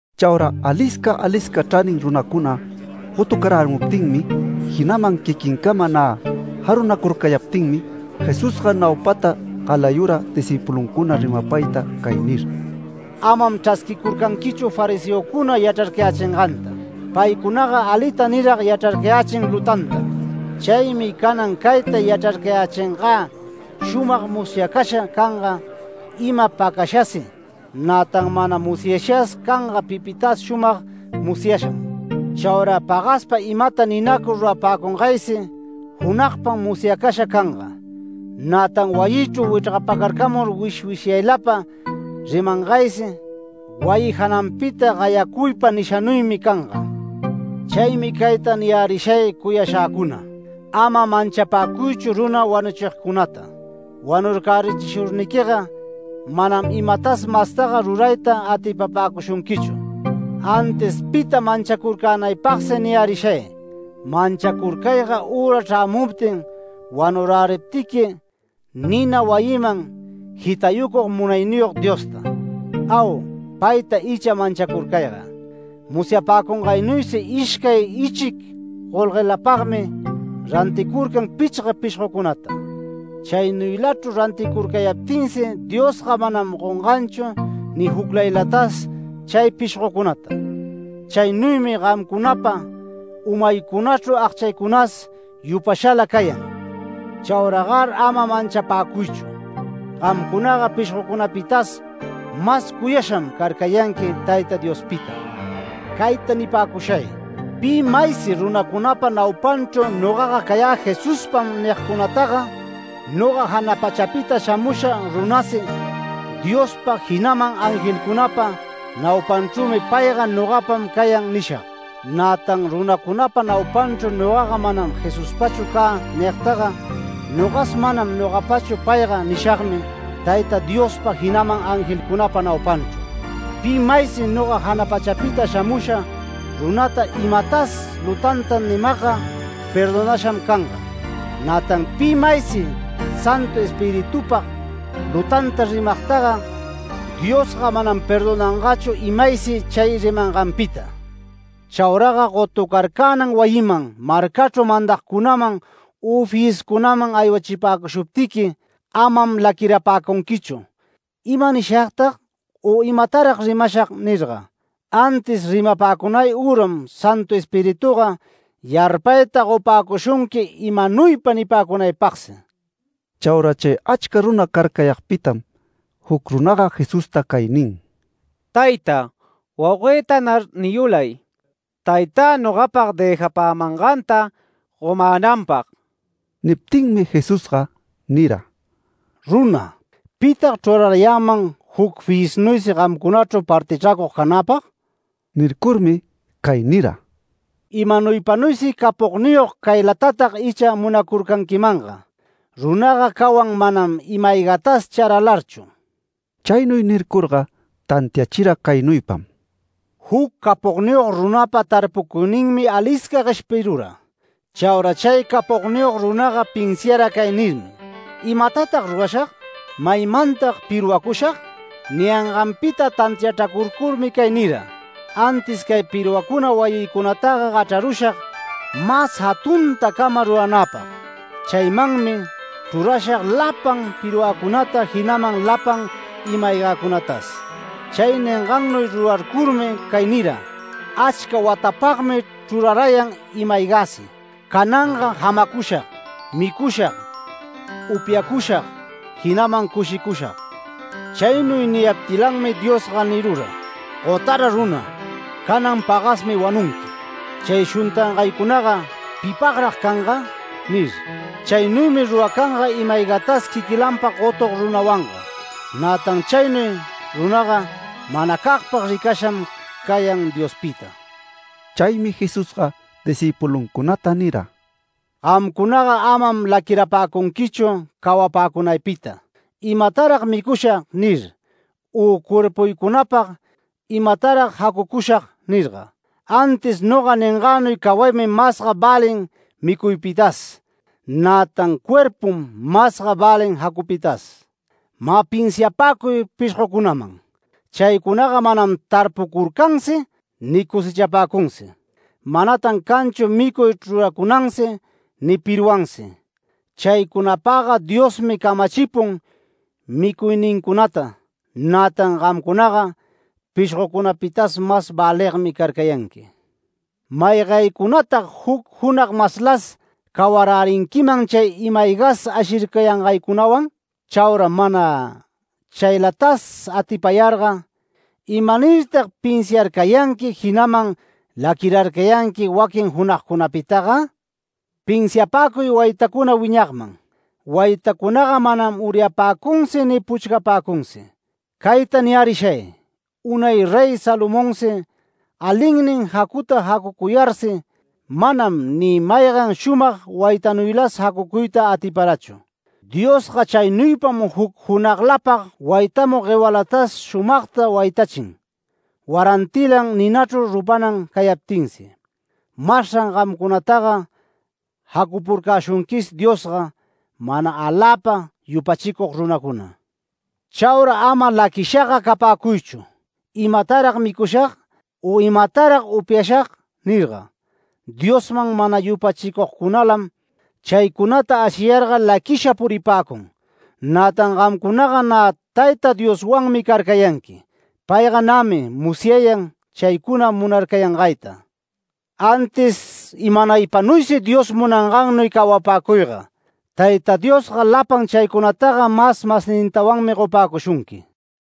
Chaura alisca alisca chranin runacuna gotucarärimuptinmi, jinaman quiquincama nä jarunacurcayaptinmi, Jesusga naupata galayura discïpuluncuna rimapayta cay nir: “Amam chrasquicurcanquichu fariseocuna yachrarcayächinganta. Paycunaga alita nirag yachrarcayächin lutantam. Chaymi canan cayta yachrarcayächingä shumag musyacasha canga ima pacashasi, nätan mana musyashas canga pipitas shumag musyasham. Chaura pagaspa imata ninacur rurapäcungaysi, junagpam musyacasha canga. Nätan wayichru wichrgapacarcamur wishwishyaylapa rimangaysi, wayi jananpita gayacuypa nishanuymi canga”. “Chaymi cayta niyärishay cuyashäcuna: Ama manchapäcuychu runa wanuchigcunata. Wanurcärichishurniquiga manam imatas mastaga rurayta atipapäcushunquichu. Antis pita manchacurcänaypagsi niyärishay: Manchacurcayga üra chrämuptin wanuräriptiqui, nina wayinman jitayucug Munayniyog Diosta. Au, payta icha manchacurcayga. Musyapäcungaynuysi ishcay ichic golguelapagmi ranticurcan pichga pishgocunata. Chaynuylachru ranticurcayaptinsi Diosga manam gonganchu ni juclaylatas chay pishgocunata. Chaynuymi gamcunapa umaycunachru agchaycunas yupashala cayan. Chauragar ama manchapäcuychu. Gamcunaga pishgocunapitas mas cuyasham carcayanqui Tayta Diospita”. “Cayta nipäcushay: Pi maysi runacunapa naupanchru ‘Nogaga cayä Jesuspam’ nigcunataga, noga jana pachapita shamusha runasi Diospa, jinaman angelcunapa naupanchrümi payga ‘Nogapam cayan’ nishag. Nätan runacunapa naupanchru nogaga ‘Manam Jesuspachu cä’ nigtaga, nogas ‘Manam nogapachu payga’ nishagmi Tayta Diospa, jinaman angelcunapa naupanchru. Pi maysi noga jana pachapita shamusha runata imatas lutanta nimagga, perdonasham canga. Nätan pi maysi Santu Espiritupag lutanta rimagtaga, Diosga manam perdonangachu imaysi chay rimanganpita. Chauraga gotucarcänan wayiman, marcachru mandagcunaman, u fiyiscunaman aywachipäcushuptiqui, amam laquirapäcunquichu ‘¿Ima nishagtag?’ u ‘¿Imatarag rimashag?’ nirga. Antis rimapäcunay üram, Santu Espirituga yarpayta gopäcushunqui imanuypa nipäcunaypagsi”. Chaura chay achca runa carcayagpitam, juc runaga Jesusta cay nin: “Tayta, wauguëtanar niyulay, taytä nogapag dëjapämanganta gomänanpag”. Niptinmi Jesusga nira: “Runa, ¿pitag chrurarayäman juc fiyisnuysi gamcunachru partichracug canäpag?” Nircurmi cay nira: “Imanaypanuysi capogniyog caylatatag icha munacurcanquimanga. Runaga cawan manam ima-aygatas charalarchu. Chaynuy nircurga tantiachira caynuypam: Juc capogniyog runapa tarpucuyninmi alisca gueshpirura. Chaura chay capogniyog runaga pinsiara cay nirmi: ‘¿Imatatag rurashag? ¿Maymantag pirwacushag?’ Niyanganpita tantiachracurcurmi cay nira: ‘Antis cay pirwacuna wayïcunataga gachrarushag mas jatuntacama ruranäpag. Chaymanmi chrurashag lapan pirwäcunata, jinaman lapan ima-aygäcunatas’. Chay ningannuy rurarcurmi cay niram: ‘Achca watapagmi chrurayan ima-aygäsi. Cananga jamacushag, micushag, upyacushag, jinaman cushicushag’. Chaynuy niyaptilanmi Diosga nirura: ‘¡Gotara runa! Canan pagasmi wanunqui. Chay shuntangaycunaga ¿pipagrag canga?’ nir. Chaynuymi ruracanga ima-aygatas quiquilanpag gotug runawanga. Nätan chaynuy runaga manacagpag ricasham cayan Diospita”. Chaymi Jesusga discïpuluncunata nira: “Gamcunaga amam laquirapäcunquichu cawapäcunaypita ‘¿Imatarag micushag?’ nir, u cuerpuycunapag ‘¿Imatarag jacucushag?’ nirga. Antis noga ningänuy cawaymi masga välin micuypitas, nätan cuerpum masga välin jacupitas. Mä pinsiapäcuy pishgocunaman. Chaycunaga manam tarpucurcansi ni cosechapäcunsi. Manatan canchu micuy chruracunansi ni pirwansi. Chaycunapagga Diosmi camachipun micuynincunata, nätan gamcunaga pishgocunapitas mas väligmi carcayanqui. ¿Maygaycunatag juc junag maslas cawarärinquiman chay imas aygas ashircayangaycunawan? Chaura mana chaylatas atipayarga, ¿imanirtag pinsiarcayanqui, jinaman laquirarcayanqui waquin junagcunapitaga? Pinsiapäcuy waytacuna wiñagman. Waytacunaga manam uryapäcunsi ni puchcapäcunsi. Cayta niyärishay: Unay Rey Salomonsi, alinnin jacuta jacucuyarsi, manam ni maygan shumag waytanuylas jacucuyta atiparachu. Diosga chaynuypam juc junaglapag waytamug guewalatas shumagta waytachin, warantilan ninachru rupanan cayaptinsi. Masran gamcunataga jacupurcäshunquis Diosga, mana aläpa yupachicug runacuna. Chaura ama laquishaga capäcuychu, ‘¿Imatarag micushag?’ u ‘¿Imatarag upyashag?’ nirga. Diosman mana yupachicugcunalam chaycunata ashiyarga laquisha puripäcun. Nätan gamcunaga nä Tayta Dioswanmi carcayanqui. Payga nämi musyayan chaycuna munarcayangayta. Antis imanaypanuysi Dios munangannuy cawapäcuyga Tayta Diosga lapan chaycunataga mas masnintawanmi gopäcushunqui.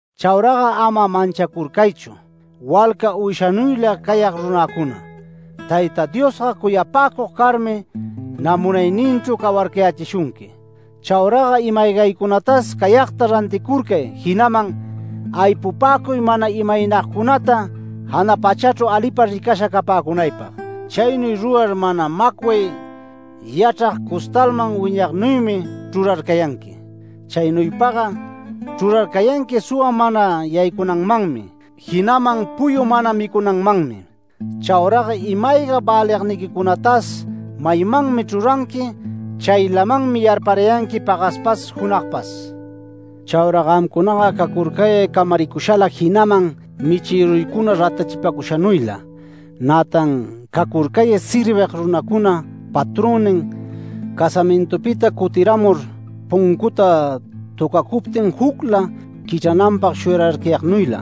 Chauraga ama manchacurcaychu, walca uyshanuyla cayag runäcuna. Tayta Diosga cuyapäcug carmi nä munayninchru cawarcayächishunqui. Chauraga ima-aygaycunatas cayagta ranticurcay, jinaman aypupäcuy mana imaynagcunata jana pachachru alipa ricasha capäcunaypag. Chaynuy rurar mana macway yachrag costalman wiñagnuymi chrurarcayanqui. Chaynuypaga chrurarcayanqui suwa mana yaycunanmanmi, jinaman puyu mana micunanmanmi. Chauraga ima-ayga väligniquicunatas maymanmi chruranqui, chaylamanmi yarparayanqui pagaspas junagpas. Chaura gamcunaga cacurcayay camaricushala, jinaman michïruycuna ratachipacushanuyla. Nätan cacurcay servig runacuna patronnin casamintupita cutiramur, puncuta töcacuptin jucla quichrananpag shuyararcayagnuyla.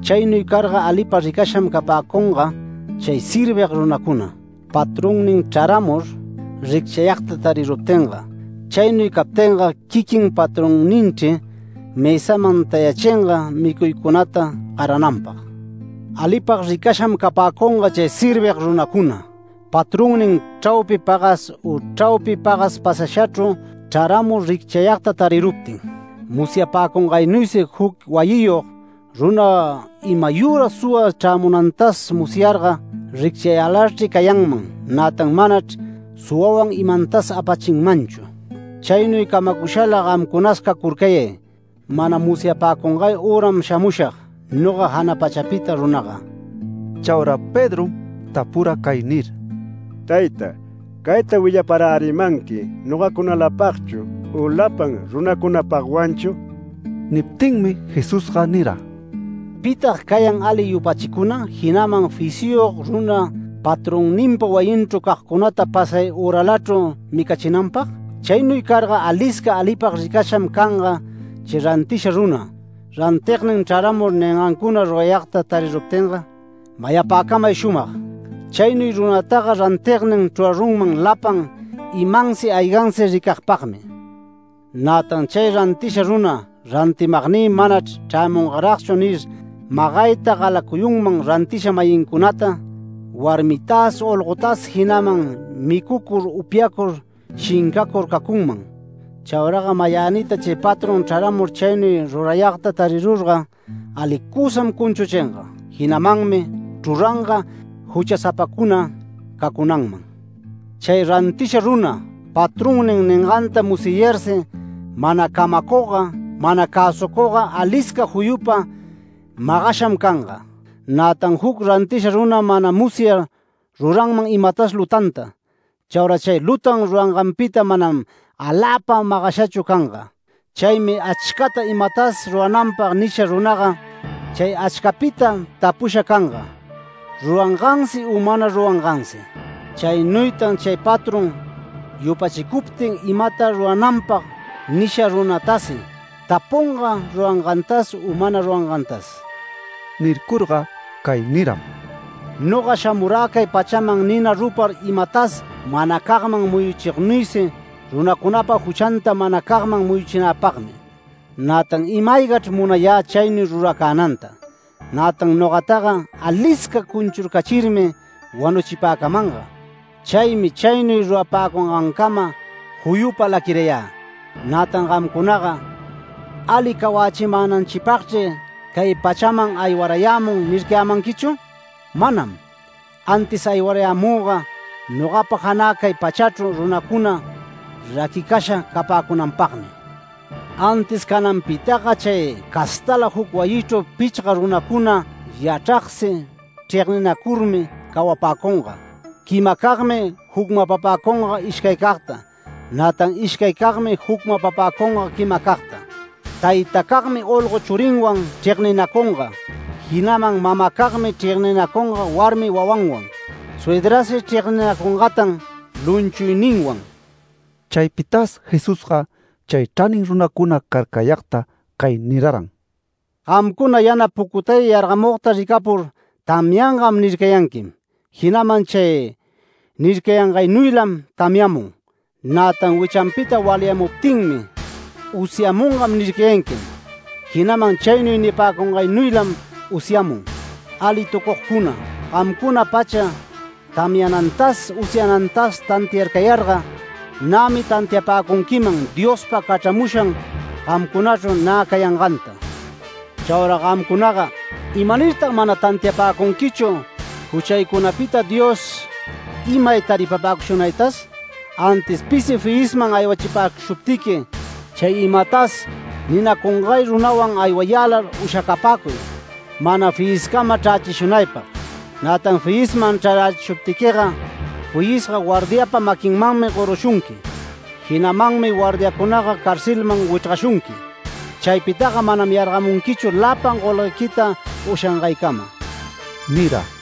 Chaynuy carga alipag ricasham capäcunga chay servig runacuna, patronnin chraramur, ricchayagta tariruptinga. Chaynuy captinga quiquin patronninchri mësaman tayachinga micuycunata garananpag. Alipag ricasham capäcunga chay servig runacuna, patronnin chraupi pagas u chraupi pagas pasashachru chraramur ricchayagta tariruptin. Musyapäcungaynuysi juc wayiyog runa imayüra suwa chrämunantas musyarga, ricchayälarchri cayanman, nätan manachr suwawan imantas apachinmanchu. Chaynuy camacushala gamcunas cacurcayay. Mana musyapäcungay üram shamushag, noga jana pachapita runaga”. Chaura Pedrom tapura cay nir: “Tayta, ¿cayta willaparärimanqui nogacunalapagchu u lapan runacunapagwanchu?” Niptinmi Jesusga nira: “¿Pitag cayan ali yupachicuna, jinaman fisyog runa patronninpa wayinchru cagcunata pasay üralachru micachinanpag? Chaynuy carga alisca alipag ricasham canga chay rantisha runa, rantignin chraramur ningancuna rurayagta tariruptinga. Mayapäcamay shumag: Chaynuy runataga rantignin chrurarunman lapan imansi aygansi ricagpagmi. Nätan chay rantisha runa ‘Rantimagnï manachr chrämungaragchu’ nir, magayta galayunman rantisha-mayincunata, warmitas olgotas jinaman micucur upyacur shincacur cacunman. Chauraga mayänita chay patrón chraramur chaynuy rurayagta tarirurga alicusam cunchuchinga. Jinamanmi chruranga juchasapacuna cacunanman. Chay rantisha runa, patronnin ninganta musyayarsi, mana camacugga, mana cäsucugga alisca juyupa magasham canga. Nätan juc rantisha runa mana musyar ruranman imatas lutanta. Chaura chay lutan ruranganpita manam aläpa magashachu canga. Chaymi achcata imatas rurananpag nisha runaga, chay achcapita tapusha canga rurangansi u mana rurangansi. Chaynuytan chay patrón yupachicuptin imata rurananpag nisha runatasi, tapunga rurangantas u mana rurangantas”. Nircurga cay niram: “Noga shamurä cay pachaman nina rupar imatas manacagman muyuchignuysi runacunapa juchanta manacagman muyuchinäpagmi. Nätan ima-aygachr munayä chaynuy ruracänanta. Nätan nogataga alisca cunchurcachirmi wanuchipäcamanga. Chaymi chaynuy rurapäcungancama juyupa laquirayä. Nätan gamcunaga, ¿‘Ali cawachimänanchipagchri cay pachaman aywarayämun’ nircayämanquichu? Manam. Antis aywarayämüga nogapa janä cay pachachru runacuna raquicasha capäcunanpagmi. Antis cananpitaga chay castala juc wayichru pichga runacuna yachragsi chregninacurmi cawapäcunga. Quimacagmi jucmapapäcunga ishcaycagta, nätan ishcaycagmi jucmapapäcunga quimacagta. Taytacagmi olgo churinwan chregninacunga, jinaman mamacagmi chregninacunga warmi wawanwan. Suydrasi chregninacungatan lumchuyninwan”. Chaypitas Jesusga chay chranin runacuna carcayagta cay niraran: “Gamcuna yana pucutay yargamugta ricapur, ‘Tamyangam’ nircayanquim. Jinaman chay nircayangaynuylam tamyamun. Nätan wichanpita walyamuptinmi, ‘Usyamungam’ nircayanquim. Jinaman chaynuy nipäcungaynuylam usyamun. ¡Alitucugcuna! Gamcuna pacha tamyanantas, usyanantas tantiarcayarga nämi tantiapäcunquiman Diospa cachramushan gamcunachru nä cayanganta. Chaura gamcunaga ¿imanirtag mana tantiapäcunquichu juchaycunapita Dios imay taripapäcushunaytas? Antis pisi fiyisman aywachishuptiqui, chay imatas ninacungay runawan aywayälar ushacapäcuy, mana fiyiscama chrächishunaypag. Nätan fiyisman chrarachishuptiquiga, fiyisga guardiapa maquinmanmi gorushunqui, jinamanmi guardiacunaga carcelman wichrgashunqui. Chaypitaga manam yargamunquichu lapan golguequita ushangaycama” nira.